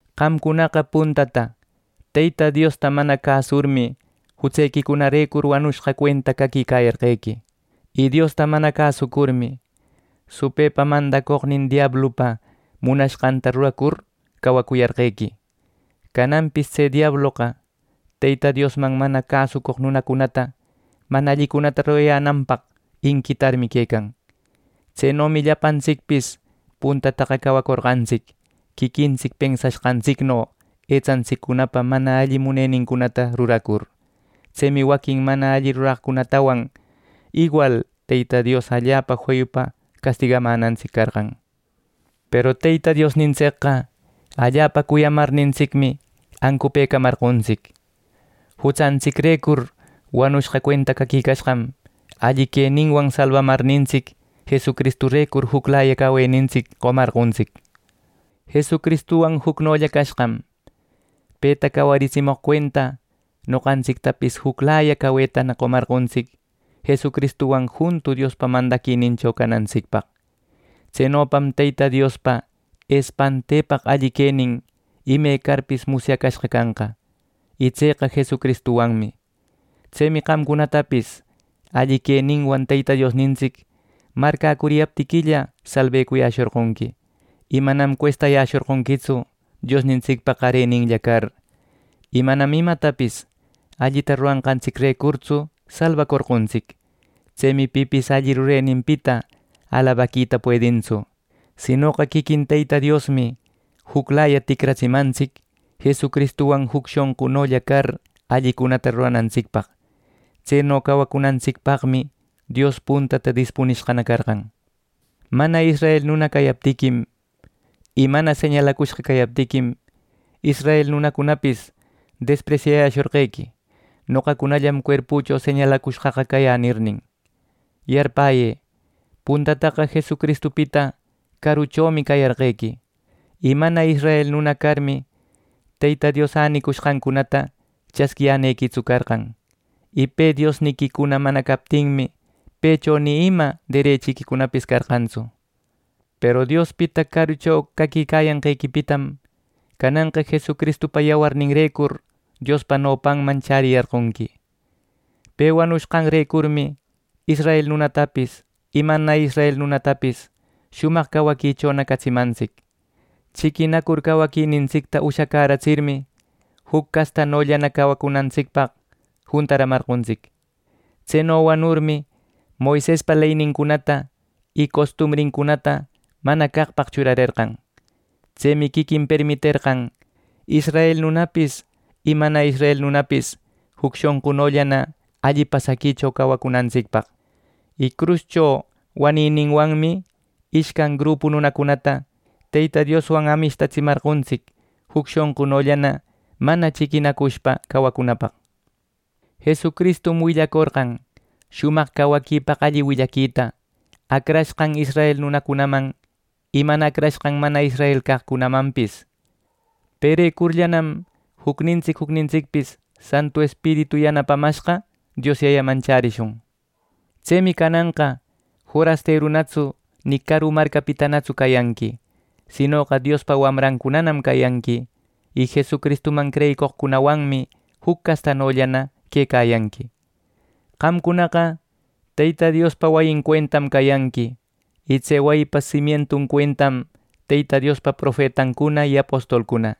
Qamcunaqa puntata Teyta Diosta mana cäsurmi jutsequicunarecur, wanushqa cuenta caquicayarqequi. Y Diosta mana cäsucurmi, supëpa mandacoqnin diablupa munashqanta ruracur cawacuyarqequi. Cananpis tse diabloqa Teyta Diosman mana cäsucoq nunacunata mana allicunata rurayänanpaq inquitarmi quecan. Tsenomi llapantsicpis puntataqa cawacorqantsic quiquintsic pensashqantsicno etsantsiccunapa mana alli munenincunata ruracur. Tsemi waquin mana alli ruraqcunatawan iwal Teyta Dios allapa feyupa castigamänantsic carqan. Peru Teyta Diosnintsicqa allapa cuyamarnintsicmi ancupëcamarqontsic. Jutsantsicrecur wanushqa cuenta caquicashqam, alli queninwan salbamarnintsic Jesucristurecur juclaya cawenintsic qomarqontsic. Jesucristuwan jucnolla cashqam, peta cawaritsimoq cuenta, noqantsictapis juclaya cawetana qomarqontsic Jesucristuwan juntu Diospa mandaquinincho canantsicpaq. Tsenopam Teyta Diospa espantepaq alli quenin ime carpis musyacashqa canqa, y tseqa Jesucristuwanmi. Tsemi qamcunatapis alli queninwan Teyta Diosnintsic marcäcuriyaptiquilla salbecuyäshorqonqui, y manam cuestayäshorqonquitsu, Diosnintsicpa qareninlla car. Y manam imatapis allita rurashqantsicrecurtsu salbacorqontsic. Tsemi pipis alli rureninpita alabaquita puedintsu. Sinoqa quiquin Teyta Diosmi juclaya ticratsimantsic Jesucristuwan juc shonqullana car allicunata ruranantsicpaq. Tseno cawacunantsicpaqmi Dios puntata dispunishqana carqan. Mana israel nuna cayaptiquim, y mana señalacushqa cayaptiquim, israel nunacunapis despresyayäshorqequi “Noqacunallam cuerpücunacho señalacushqaqa cayä” nirnin. Yarpäyë, puntataqa Jesucristupita caruchomi cayarqequi, y mana israel nuna carmi, Teyta Dios änicushqancunata chasquiyänequitsu carqan. Y Pe Diosniquicuna mana captinmi, pëcho ni ima derechiquicunapis carqantsu. Peru Diospita carucho caquicayanqequipitam cananqa Jesucristupa yawarninrecur Diospa nopanman chäriyarqonqui. Pe wanushqanrecurmi israel nunatapis y mana israel nunatapis shumaq cawaquichona catsimantsic. Chiquinacur cawaquinintsicta ushacäratsirmi, juc castanollana cawacunapaq juntaramarqontsic. Tseno wanurmi, Moisespa leynincunata y costumbrincunata mana caqpaq churarerqan. Tsemi quiquin permiterqan israel nunapis y mana israel nunapis juc shonqunollana alli pasaquicho cawacunantsicpaq. Y cruscho wanïninwanmi ishcan grupu nunacunata Teyta Dioswan amishtatsimarqontsic, juc shonqunollana manana chiquinacushpa cawacunapaq. Jesucristum willacorqan shumaq cawaquipaq alli willaquita, acrashqan israel nunacunaman y mana acrashqan, mana israel caqcunamanpis. Perecurllam jucnintsic jucnintsicpis Santu Espiritu yanapamashqa Dios Yayaman chärishun. Tsemi cananqa forasterunatsu ni caru marcapitanatsu cayanqui, sinoqa Diospa wamrancunanam cayanqui, y Jesucristuman creyicoqcunawanmi juc castanollana quecayanqui. Qamcunaqa Teyta Diospa wayin cuentam cayanqui, y tse wayipa simientun cuentam Teyta Diospa profetancuna y apostolcuna,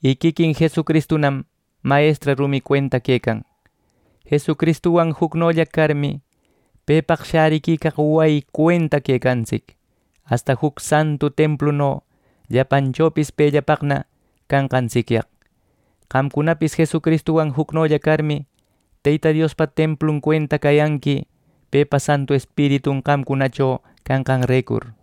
y quiquin Jesucristunam mayestra rumi cuenta quecan. Jesucristuwan jucnolla carmi, pepaq shäriquicaq wayin cuenta quecantsic, asta juc santu templuno llapanchopis pellapaqna canqantsicyaq. Qamcunapis Jesucristuwan jucnolla carmi, Teyta Diospa templun cuenta cayanqui pepa Santu Espiritun qamcunacho canqanrecur.